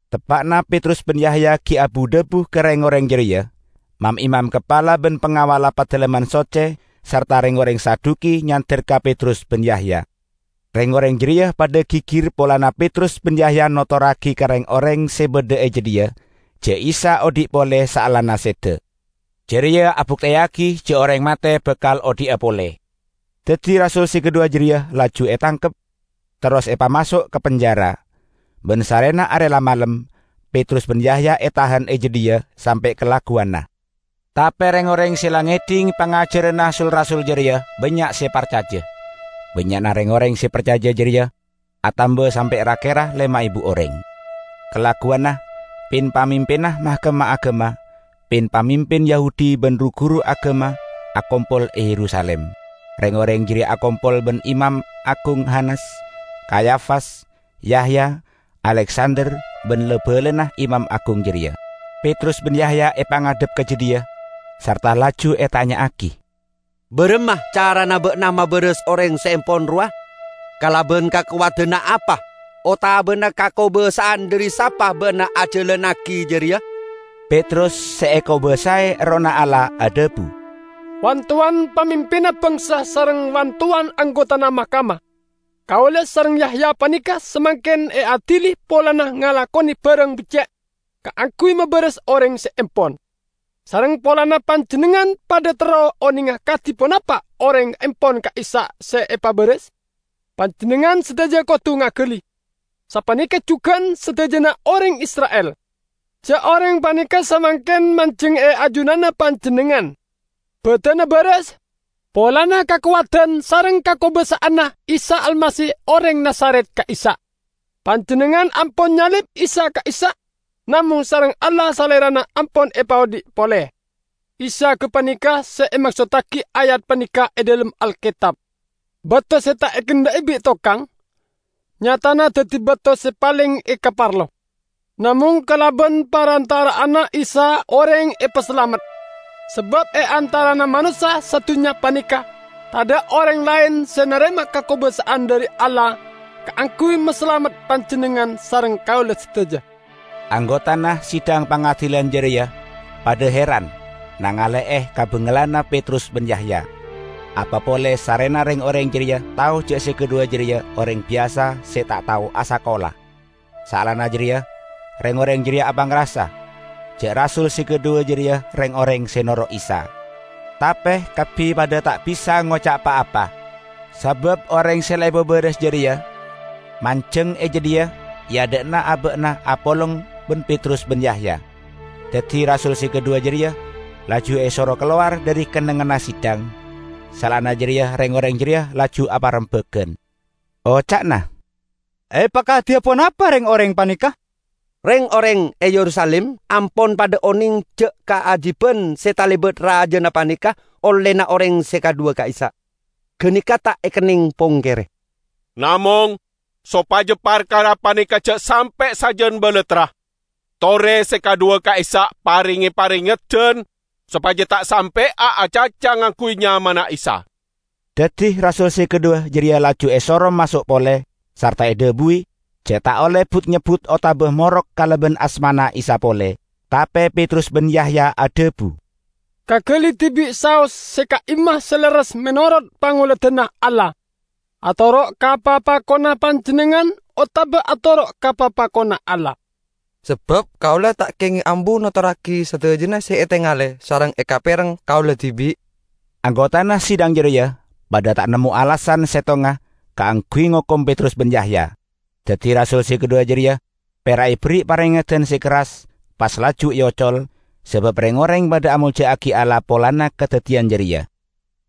Teppa'na Petrus ban Yahya gi' abu-dhabu bi' reng-oreng jareya, mam-imam kapala ban pangawalla Padalemman Socce sarta reng-oreng Saduki nyander ka Petrus ban Yahya. Reng-oreng jareya padha gigir polana Petrus ban Yahya notorragi ka reng-oreng se badha e jadhiya ja' Isa odhi' pole saellana seda. Jareya abukteyagi ja' oreng mate bakal odhi'a pole. Daddi rasul se kadhuwa jareya laju etangkep, terros epamaso' ka penjara. Ban sarrena are la malem, Petrus ban Yahya etahan e jadhiya sampe' kalagguwanna. Tape reng-oreng se la ngedhing pangajaranna sul-rasul jareya bannya' se parcaja. Bannya'na reng-oreng se parcaja jareya atamba sampe' ra-kera lema ebu oreng. Kalagguwanna pin-pamimpinna Mahkamah Agama, pin-pamimpin Yahudi ban ru-guru agama akompol e Yerusalim. Reng-oreng jareya akompol ban Imam Agung Hanas, Kayafas, Yahya, Aleksander ban la-balana imam agung jareya. Petrus ban Yahya epangadhep ka jadhiya, sarta laju etanya'agi, "Baramma carana ba'na mabaras oreng se empon rowa? Kalaban kakowadanna apa otabana kakobasa'an dhari sapa ba'na ajalannagi jareya?" Petrus, se ekobasae Errohna Allah adhabu, "Wan-towan pamimpinna bangsa sareng Wan-towan anggotana Mahkamah! Kaula sareng Yahya paneka samangken eadili polana ngalakone barang becce' kaangguy mabaras oreng se empon, sareng polana panjennengngan padha terro onenga kadi ponapa oreng empon ka'issa' se epabaras. Panjennengngan sadaja kodu ngagali, sapaneka jugan sadajana oreng Isra'il, ja' oreng paneka samangken manjeng e ajunanna panjennengngan, badanna baras, polana kakowadan sareng kakobasa'anna Isa Almasih oreng Nazaret ka'issa'. Panjennengngan ampon nyalib Isa ka'issa', namong sareng Allah salerana ampon epaodhi' pole. Isa gapaneka se emaksottagi ayat paneka e dhalem Alketab, 'Bato se ta' ekendha'i bi' tokang, nyatana daddi bato se paleng ekaparlo.' Namong kalaban parantara'anna Isa oreng epasalamet. Sabab e antarana manossa sadunnya paneka tadha' oreng laen se narema kakobasa'an dhari Allah kaangguy masalamet panjennengngan sareng kaula sadaja." Anggotana Sidang Pangadilan jareya padha heran nangale'e kabangalanna Petrus ban Yahya, apa pole sarrena reng-oreng jareya tao ja' se kadhuwa jareya oreng biyasa se ta' tao asakola. Saellana jareya reng-oreng jareya apangrasa ja' rasul se kadhuwa jareya reng-oreng se noro' Isa. Tape kabbi padha ta' bisa ngoca' pa-apa, sabab oreng se la epabaras jareya manjeng e jadhiya e adha'na aba'na apolong ban Petrus ban Yahya. Daddi rasul se kadhuwa jareya laju esoro kalowar dhari kennengnganna sidang. Saellana jareya reng-oreng jareya laju aparembagan, oca'na, "Epakadiya ponapa reng-oreng paneka? Reng-oreng e Yerusalim ampon padha oneng ja' kaajiban se talebat rajana paneka ollena oreng se kadhuwa ka'issa'. Ganeka ta' ekenneng pongkere. Namong sopaja parkara paneka ja' sampe' sajan balattra, tore se kadhuwa ka'issa' parenge parengeddan sopaja ta' sampe'a acaca ngangguy nyamana Isa." Daddi rasul se kadhuwa jareya laju esoro maso' pole, sarta edhabuwi ja' ta' olle but-nyebbut otaba morok kalaban asmana Isa pole. Tape Petrus ban Yahya adhabu, "Kagali dibi' saos se ka'imma se lerres menorot pangoladanna Allah: atoro' ka papakonna panjennengngan otaba atoro' ka papakonna Allah. Sabab kaula ta' kengeng ambu notorragi sadajana se etengale sareng ekapereng kaula dibi'." Anggotana sidang jareya padha ta' nemmo alasan settonga kaangguy ngokom Petrus ban Yahya. Daddi rasul se kadhuwa jareya pera' eberri' parengeddan se kerras, pas laju eocol, sabab reng-oreng padha amolja'agi Allah polana kadaddiyan jareya.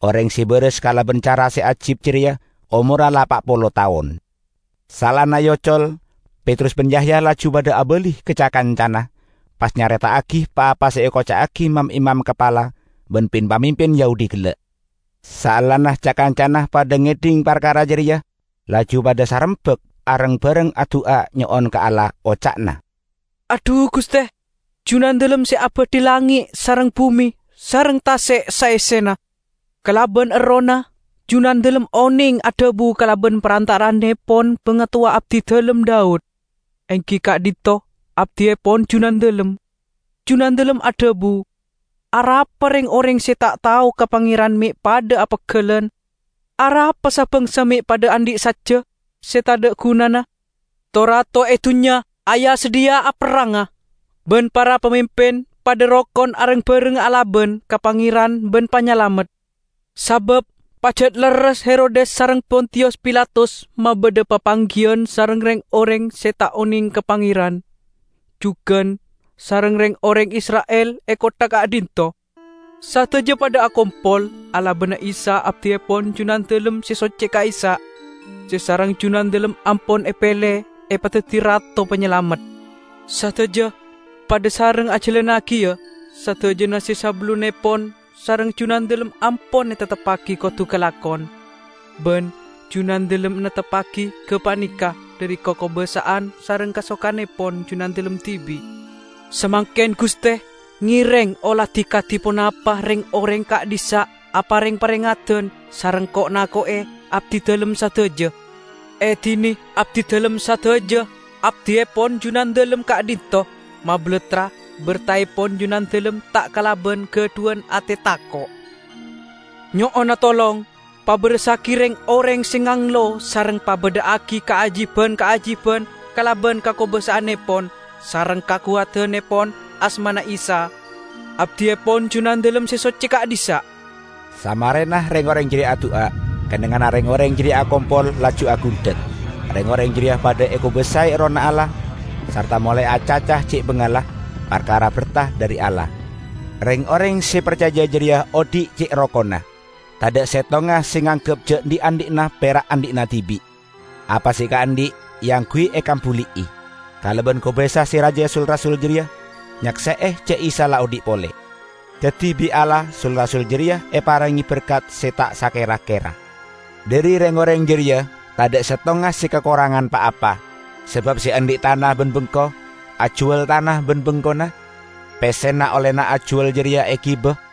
Oreng se baras kalaban cara se ajib jareya omorra la pa' polo taon. Saellana eocol, Petrus ban Yahya laju padha abali ka ca-kancana; pas nyareta'agi pa-apa se ekoca'agi mam-imam kapala ban pin-pamimpin Yahudi gella'. Saellana ca-kancana padha ngedhing parkara jareya, laju padha sarembak areng-bareng adu'a nyo'on ka Allah, oca'na, "Adhu, Guste, Junandalem se abadhi langnge' sareng bume sareng tase' saessena. Kalaban Errohna, Junandalem oneng adhabu kalaban parantara'annepon bangatowa abdidalem, Daud, enggi ka'dhinto' abdiepon Junandalem; Junandalem adhabu, 'Arapa reng-oreng se ta' tao ka Pangeran me' padha apeggellan; arapa sa-bangsa me' padha andhi' sajja se tadha' gunana? To-rato e dunnya aya-sadhiya aperranga, ban para pamimpin padha rokon areng-bareng alaban ka Pangeran ban Panyalamet.' Sabab pajat lerres Herodes sareng Pontiyus Pilatus mabadha papanggiyan sareng reng-oreng se ta' oneng ka Pangeran, jugan sareng reng-oreng Isra'il e kottha ka'dhinto'. Sadaja padha akompol alabana Isa abdiepon Junandalem se socce ka'issa', se sareng Junandalem ampon epele epadaddi Rato Panyalamet. Sadaja padha sareng ajalannagiya sadajana se sabellunnepon sareng Junandalem ampon etepteppagi kodu kalakon; ban Junandalem neptebbagi gapaneka dhari kakobasa'an sareng kasokannepon Junandalem dibi'. Samangken, Guste, ngereng oladi kadi ponapa reng-oreng ka'dhissa' apareng parengeddan sareng ko'-nako'e abdidalem sadaja. Edine abdidalem sadaja, abdiepon Junandalem ka'dhinto', mabalattra bertaepon Junandalem ta' kalaban gadhuwan ate tako'. Nyo'ona tolong pabarassagi reng-oreng se nganglo sareng pabadha'agi kaajiban-kaajiban kalaban kakobasa'annepon sareng kakowadannepon asmana Isa, Abdiepon Junandalem se socce ka'dhissa'." Samarena reng-oreng jareya adu'a, kennengnganna reng-oreng jareya akompol laju agundhek. Reng-oreng jareya padha ekobasae Errohna Allah, sarta molae acaca ce' bangalla parkara berta dhari Allah. Reng-oreng se parcaja jareya odhi' ce' rokonna. Tadha' settonga se nganggep ja' dhi'-andhi'na pera' andhi'na dibi'. Apa se ekaandhi' eangguy ekambuli'i. Kalaban kobasa se raja sul-rasul jareya nyakse'e ja' Isa la odhi' pole. Daddi bi' Allah sul-rasul jareya eparenge berkat se ta' sakera-kera. Dhari reng-oreng jareya tadha' settonga se kakorangan pa-apa. Sabab se andhi' tana ban bengko, ajuwal tana ban bengkona; pessena ollena ajuwal jareya egiba,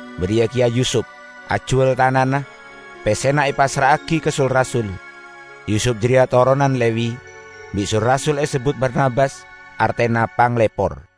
Bariya keya Yusup, ajuwal tanana, pessena epassra'agi ka sul-rasul. Yusup jareya toronan Lewi; bi' sul-rasul esebbut Barnabas (artena Panglepor).